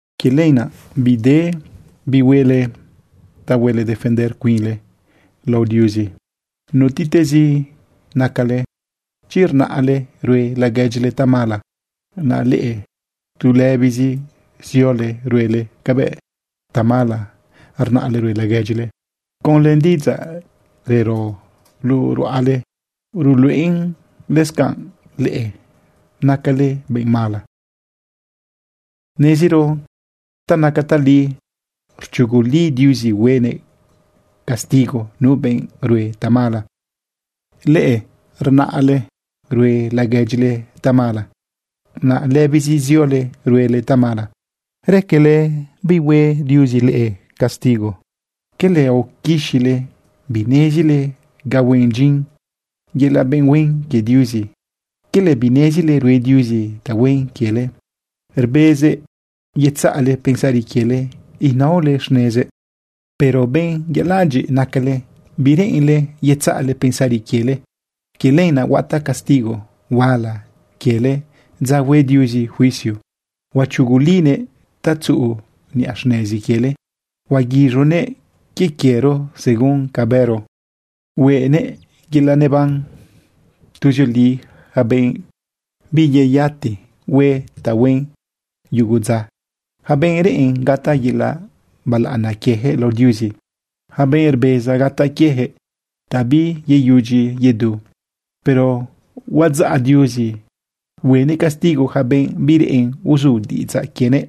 Quie lenaꞌ bide bihuele ta huele defender cuinle lao Diuzi, nutiꞌtezi nacale, chi rnale rue laguedyile tamala, naꞌ leꞌe tu lëbizi ziole ruele cabëꞌ tamala rnale rue laguedyile. Conlë diꞌidzaꞌ rero luꞌu ruꞌale ruluꞌen lëscanꞌ leꞌe nacale benꞌ mala. Neziro ta naca tali rchuguli Diuzi huenëꞌ castigo nu benꞌ rue tamala. Leꞌe rnale rue laguedyile tamala, naꞌ lëbizi ziole ruele tamala, ¿raquele bihue Diuzi leꞌe castigo? ¿Quele aoquixile binezile ga huen dyin yelaꞌ benꞌ huen quie Diuzi? ¿Quele binezile rue Diuzi tahuen quiele rbezëꞌ yetzaꞌle pensari quiele inaole xnezëꞌ? Pero benꞌ yaladyiꞌ nacale, bireꞌenle yetzaꞌle pensari quiele. Quie lenaꞌ huataꞌ castigo huala quiele dza hue Diuzi juicio. Huachugulinëꞌ ta tzuꞌu niꞌa xnezi quiele. Huaguiz̃unëꞌ quie quiero según ca bëro. Hueꞌnëꞌ yelaꞌ neban tuzioli yaca benꞌ biyeyati hue tahuen yugu dza, yaca benꞌ reꞌen gataꞌ yelaꞌ balaꞌana quiejëꞌ lao Diuzi, yaca benꞌ rbeza gataꞌ quieyaquëꞌ ta biyeyudyi yedu. Pero huadzaꞌ Diuzi huenëꞌ castigo yaca benꞌ bireꞌen uzu diꞌidzaꞌ quienëꞌ,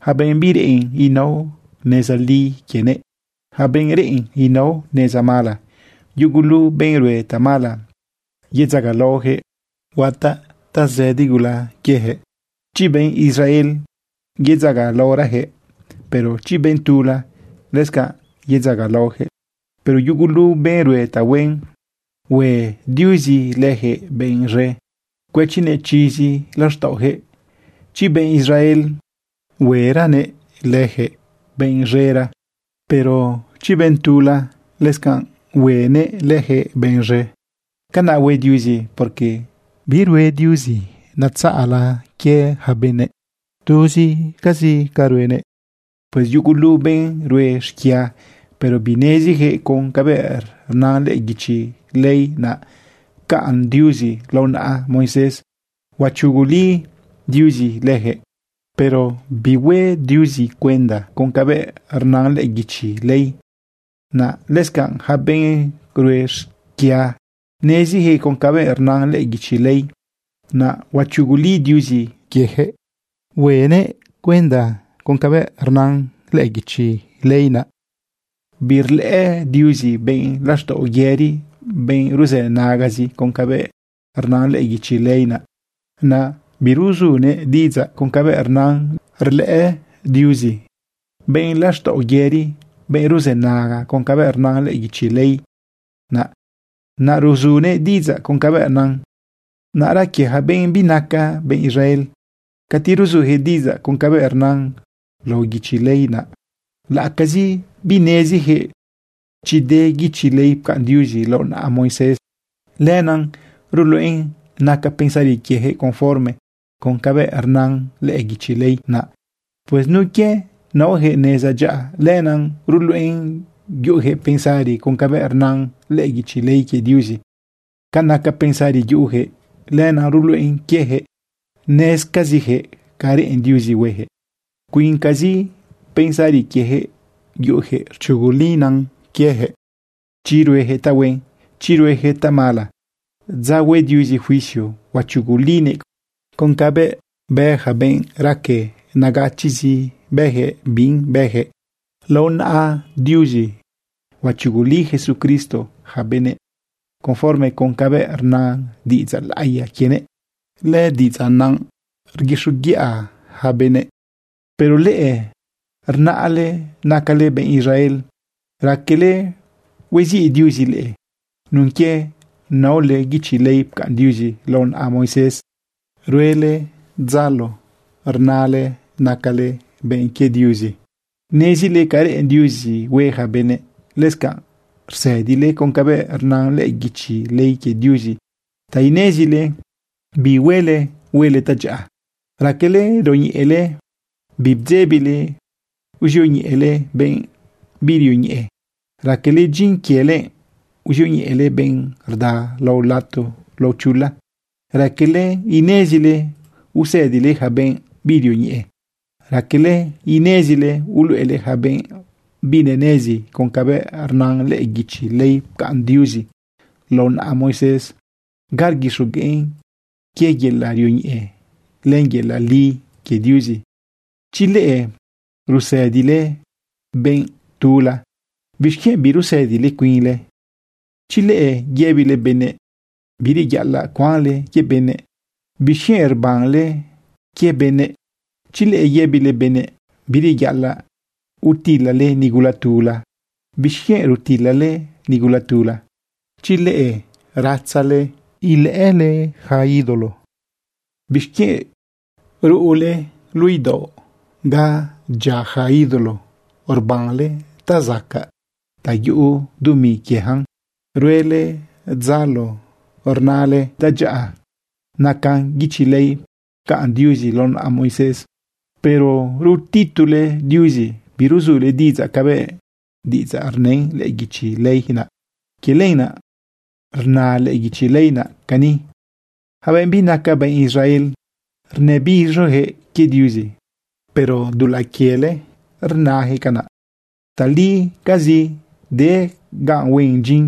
yaca benꞌ bireꞌen inao neza li quienëꞌ, yaca benꞌ reꞌen inao neza mala. Yugulu benꞌ rue tamala yedzagalaoyaquëꞌ, huataꞌ tazëdi gula quieyaquëꞌ. Chi benꞌ Israel yedzagalaorayaquëꞌ, pero chi benꞌ tula, lëscanꞌ yedzagalaoyaquëꞌ. Pero yugulu benꞌ rue tahuen, hue Diuzi leyaquëꞌ benꞌ z̃e, cuëchinëꞌ chizi laxtaꞌoyaquëꞌ. Chi benꞌ Israel hueranëꞌ leyaquëꞌ benꞌ z̃era, pero chi benꞌ tula, lëscanꞌ huenëꞌ leyaquëꞌ benꞌ z̃e. Canaꞌ hue Diuzi, porque birue Diuzi natzaꞌla quie yaca benëꞌ, tuzcazi ca ruenëꞌ. Pues yugulu benꞌ rue xquia, pero binezijëꞌ con cabëꞌ rna lëꞌë guichi ley naꞌ pcaꞌn Diuzi lao naꞌa Moisés, huachuguli Diuzi lëjëꞌ, pero bihue Diuzi cuenda con cabëꞌ rna lëꞌë guichi ley naꞌ. Lëscanꞌ yaca benꞌ rue xquia nezijëꞌ con cabëꞌ rna lëꞌë guichi ley naꞌ, huachuguli Diuzi lëjëꞌ huenëꞌ cuenda con cabëꞌ rna lëꞌë guichi ley naꞌ. Birlëꞌë Diuzi benꞌ laxtaꞌo yëri benꞌ ruzënagazi con cabëꞌ rna lëꞌë guichi ley naꞌ, naꞌ biruzunëꞌ diꞌidzaꞌ con cabëꞌ rnan. Rlëꞌë Diuzi benꞌ laxtaꞌo yëri benꞌ ruzënaga con cabëꞌ rna lëꞌë guichi ley naꞌ, naꞌ ruzunëꞌ diꞌidzaꞌ con cabëꞌ nan. Naꞌra quie ja benꞌ binaca benꞌ Israel, cati ruzujëꞌ diꞌidzaꞌ con cabëꞌ rnan lao guichi ley naꞌ, laꞌacazi binezijëꞌ chi de guichi ley pcaꞌn Diuzi lao naꞌa Moisés, lenaꞌ ruluꞌen naca pensari quiejëꞌ conforme con cabëꞌ rnan lëꞌë guichi ley naꞌ. Pues nun quie naojëꞌ neza dyaꞌa, lenaꞌ ruluꞌen yuꞌujëꞌ pensari con cabëꞌ rnan lëꞌë guichi ley quie Diuzi. Ca naca pensari yuꞌujëꞌ, lenaꞌ ruluꞌen quiejëꞌ nezcazijëꞌ ca reꞌen Diuzi huejëꞌ. Cuincazi pensari quiejëꞌ yuꞌujëꞌ rchugulina quiejëꞌ chi ruejëꞌ tahuen, chi ruejëꞌ tamala. Dza hue Diuzi juicio huachugulinëꞌ con cabëꞌ bë yaca benꞌ raque nagachiꞌzi bëjëꞌ binꞌ bëjëꞌ. Lao naꞌa Diuzi huachuguli Jesucristo yaca benëꞌ conforme con cabëꞌ rna diꞌidzaꞌ laꞌiya quienëꞌ. Lëdiꞌidzaꞌ naꞌ rguixoguiꞌa yaca benëꞌ. Pero leꞌe rnale nacale benꞌ Israel. Raquele hueziꞌ Diuzi leꞌe nun quie naole guichi ley pcaꞌn Diuzi lao naꞌa Moisés. Ruele dzalo inale nacale benꞌ quie Diuzi. Nezile ca reꞌen Diuzi hue yaca benëꞌ. Lëscanꞌ rsëdile con cabëꞌ rna lëꞌë guichi ley quie Diuzi ta inezile bi huele huele tadyaꞌa. Raquele rioñeꞌele, bidzebile uzioñeꞌele benꞌ birioñeꞌe. Raquele dyin quiele uzioñeꞌele benꞌ rda lao lato lao chula. Raquele inezile usëdile yaca benꞌ birioñeꞌe. Raquele inezile uluꞌele yaca benꞌ binenezi con cabëꞌ rna lëꞌë guichi ley pcaꞌn Diuzi lao naꞌa Moisés ga rguixogueꞌn quie yelaꞌ rioñeꞌe len yelaꞌ li quie Diuzi. Chi leꞌe rusëdile benꞌ tula, ¿bixquienꞌ birusëdile cuinle? Chi leꞌe yëbile benëꞌ bireyaꞌalaꞌ cuanle quie benëꞌ, ¿bixquienꞌ rbanle quie benëꞌ? Chi leꞌe yëbile benëꞌ bireyaꞌalaꞌ utilale nigula tula, ¿bixquienꞌ rutilale nigula tula? Chi leꞌe ratzale ilëꞌële yaca ídolo, ¿bixquienꞌ ruꞌule luꞌu idaoꞌ ga rdyia yaca ídolo rbanle ta zacaꞌ ta yuꞌu dumi quieyacan? Ruele dzalo inale tadyaꞌa naca guichi ley pcaꞌn Diuzi lao naꞌa Moisés, pero rutitule Diuzi biruzule diꞌidzaꞌ cabëꞌ diꞌidzaꞌ rnën lëꞌë guichi ley naꞌ. Quie lenaꞌ rna lëꞌë guichi ley naꞌ cani: “Yaca benꞌ binaca benꞌ Israel, rnëbiz̃oyaquëꞌ quie Diuzi, pero dulaꞌ quiele rnajëꞌ canaꞌ.” Talicazi de ga huen dyin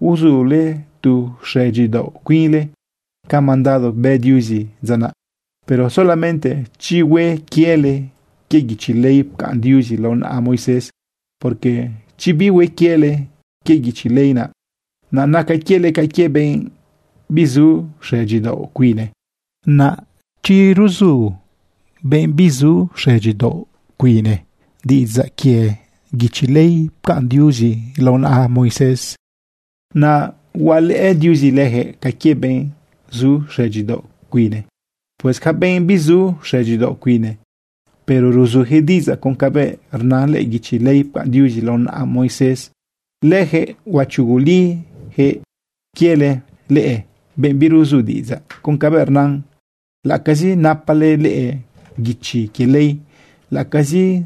uzule tu xëdyidaoꞌ cuinle ca mandado bë Diuzi dza naꞌ, pero solamente chi hue quiele quie guichi ley pcaꞌn Diuzi lao naꞌa Moisés. Porque chi bihue quiele quie guichi ley naꞌ, naꞌ naca quiele ca quie benꞌ bizu xëdyidaoꞌ cuine. Naꞌ chi ruzu benꞌ bizu xëdyidaoꞌ cuine diꞌidzaꞌ quie guichi ley pcaꞌn Diuzi lao naꞌa Moisés, naꞌ hualëꞌë Diuzi lëjëꞌ ca quie benꞌ zu xëdyidaoꞌ cuine. Pues yaca benꞌ bizu xëdyidaoꞌ cuine, pero ruzuyaquëꞌ diꞌidzaꞌ con cabëꞌ rna lëꞌë guichi ley pcaꞌn Diuzi lao naꞌa Moisés, lëjëꞌ huachugulijëꞌ quiele leꞌe, benꞌ biruzu diꞌidzaꞌ con cabëꞌ rnan, laꞌacazi napale leꞌe guichi quie ley, laꞌacazi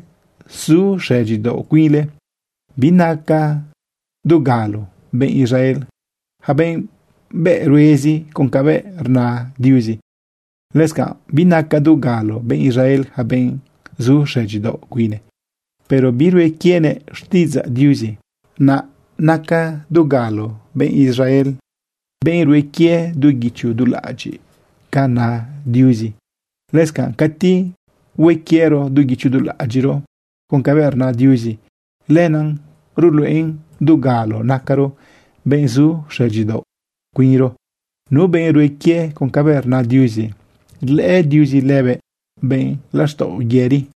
zu xëdyidaoꞌ cuinle. Binaca dugalo benꞌ Israel yaca benꞌ bëꞌruezi con cabëꞌ rna Diuzi. Lëscanꞌ binaca dugalo benꞌ Israel yaca benꞌ zu xëdyidaoꞌ cuine, pero birue quienëꞌ xtiꞌidzaꞌ Diuzi. Naꞌ naca dugalo benꞌ Israel benꞌ rue quie du guicho du laꞌadyiꞌ ca na Diuzi. Lëscanꞌ cati hue quiero du guicho du laꞌadyiꞌro con cabëꞌ rna Diuzi, lenaꞌ ruluꞌen dugalo nacaro benꞌ zu xëdyidaoꞌ cuinro. Nu benꞌ rue quie con cabëꞌ rna Diuzi, rlëꞌë Diuzi lëbëꞌ benꞌ laxtaꞌo yëri.